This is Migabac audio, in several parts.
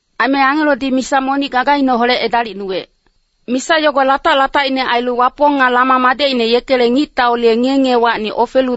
Aime angelodi misa monic gagaineholec edalicnuwec. Misa yogo latac-latacine ailu Wapong nga Lama madecine yekele ngictaule ngiye-ngiyewacni ofelu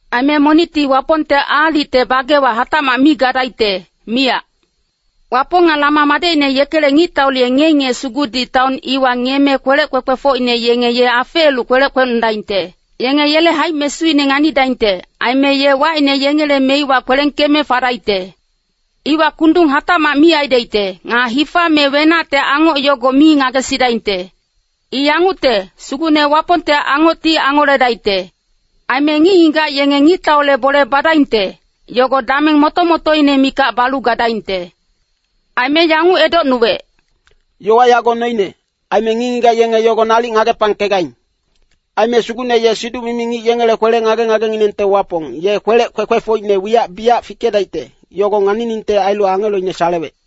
Aime monicti Wapongte aalicte bagewa hatacmac mi gadaicte, miyac. Wapong nga Lama madecine yekele ngictaule ngiye-ngiye sugudi taon iwa ngiyeme kwelec kwekwefocine yenge ye afeelu kwelec kwecnodaingte. Yenge yele haic-mesuine nganidaingte, aime ye wacine yengele meiwa kwelengkeme fadaicte. Iwa kundung hatacmac mi aidaicte, nga hifa me wenacte angoc yogo mi ngagesidaingte. I yangucte, Sugucne Wapongte angocti angoledaicte. Aime ngic-ngigac yenge ngictaule bole badaingte, yogo dameng moto-motoine mikac balu gadaingte. Aime yanguc edocnuwec, “Yowa yago noine, aime ngic-ngigac yenge yogo nalic ngagepangkegaing. Aime Sugucne ye siduc-mimi ngic yengele kwele-ngage-ngagenginengte Wapong, ye kwelec kwekwefocine wiyac biyac fikedaicte, yogo nganiningte ailu angeloine salewec.”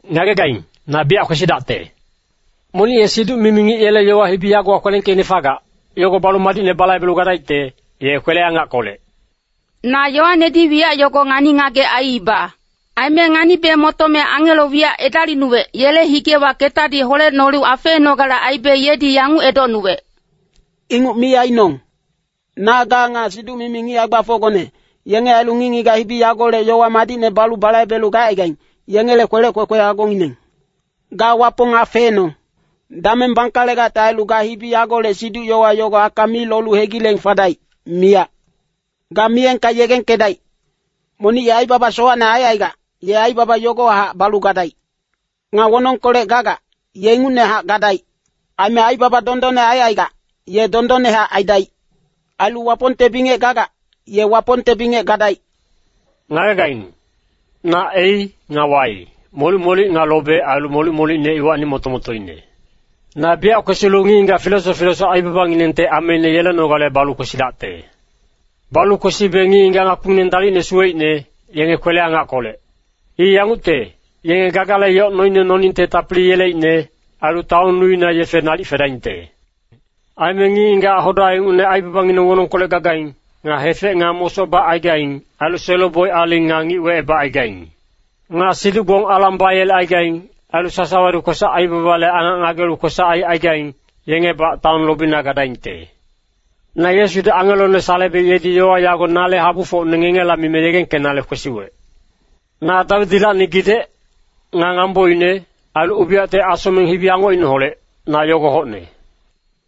“Ngagegaing, na biyac kwesidacte! Monic ye siduc-mimi ngic yele yowa hibi yagowa kwelengkeicne fagac, yogo balu madicne balaibelu gadaicte, ye kwele-angackolec.” Na Yoanedi wiyac yogo ngani-ngagec aiiba. Aime nganibe motome angelo wiyac edalicnuwec, yele higewa ketadi holecnolu afeenogale aibe yedi yanguc edocnuwec, “Inguc mi ainong. Na ga nga siduc-mimi ngic hae-gbafocgone, yenge ailu ngic-ngigac hibi yagolec yowa madicne balu balaibelu gacaigaing, ngengele kwelec kwekwe agongineng. Ga Wapong afeenong! “Dameng bangkalegacte ailu ga hibi yagolec siduc-yowa yogo aka mi lolu hegileng fadaic, miyac. Ga miyengka yegengkedaic. Monic ye aibaba sowacne aicaigac, ye aibaba yogohac balu gadaic. Nga wonongkolec gagac, ye ingucnehac gadaic. Aime aibaba dondonne aicaigac, ye dondonnehac aidaic. Ailu Wapongte bingec gagac, ye Wapongte bingec gadaic.” “Ngagegaing, na ‘A’ nga ‘Y’, molic-molic nga lobe, ailu molic-molicine iwacni moto-motoine. Na biyac kwesilu ngic-ngigac filesoc filesoc aibabanginengte ameine yelenogale balu kwesidacte. Balu kwesibe ngic-ngigac ngakpingineng dalicne suweicne, yenge kwele-angackolec. I yangucte, yenge gagale yoc noine noningte tapili yeleicne, ailu taon nuina yefe nalic fedaingte. Aime ngic-ngigac hoda ingucne aibabangineng wonongkolec gagaing, nga hefec nga mosoc bacaigaing, ailu selo-boic aling nga ngic wecebacaigaing. Nga siduc-gbong alang bayelecaigaing, ailu sasawadi kwesac-aibabale angac ngagelu kwesac aicaigaing, yengebac taon lobina gadaingte. Na Yesudi angelone salebe yedi yowa yago nale habufocne ngengela mime yegengkengelenale kwesiwec. Na Dawidilacni gidec, nga ngamboine, ailu ubiyacte asocmeng hibi-angocineholec, na yogo hocne.”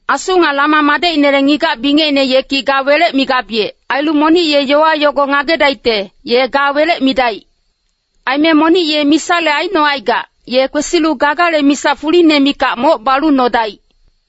Asu nga Lama madecinele ngigac-bingecine yeki “Ga welec” migabiyec. Ailu monic ye yowa yogo ngagedaicte, ye “Ga welec” midaic. Aime monic ye misale aicnocaigac, ye kwesilu gagale misa fuline mikac moc balu nodaic.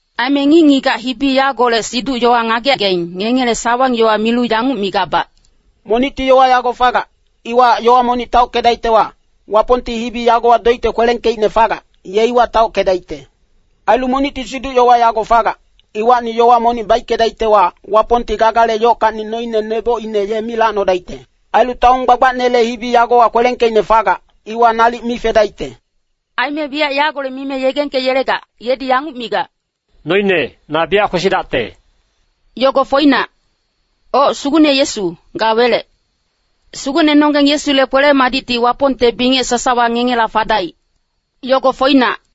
Aime ngic-ngigac hibi yagolec siduc-yowa ngagegaing, ngengele sawang-yowa milu yanguc migabac, “Monicti yowa yago fagac, iwahac yowa monic taockedaictewa, Wapongti hibi yagowa doicte kwelengkeicne fagac, ye iwa taockedaicte. Ailu monicti siduc-yowa yago fagac, iwacni yowa monic baickedaictewa, Wapongti gagale yockacni noine nebocine ye mi lacnodaicte. Ailu taon gbagbacnele hibi yagowa kwelengkeicne fagac, iwa nalic mi fedaicte.” Aime wiyac yagolec mime yegengkengelegac, yedi yanguc migac, “Noine, na biyac kwesidacte.” Yogo foinac. Oc, Sugucne Yesu, ga welec. Sugucnenonggeng Yesule kwele-madicti Wapongte bingec sasawa ngengela fadaic. Yogo foinac.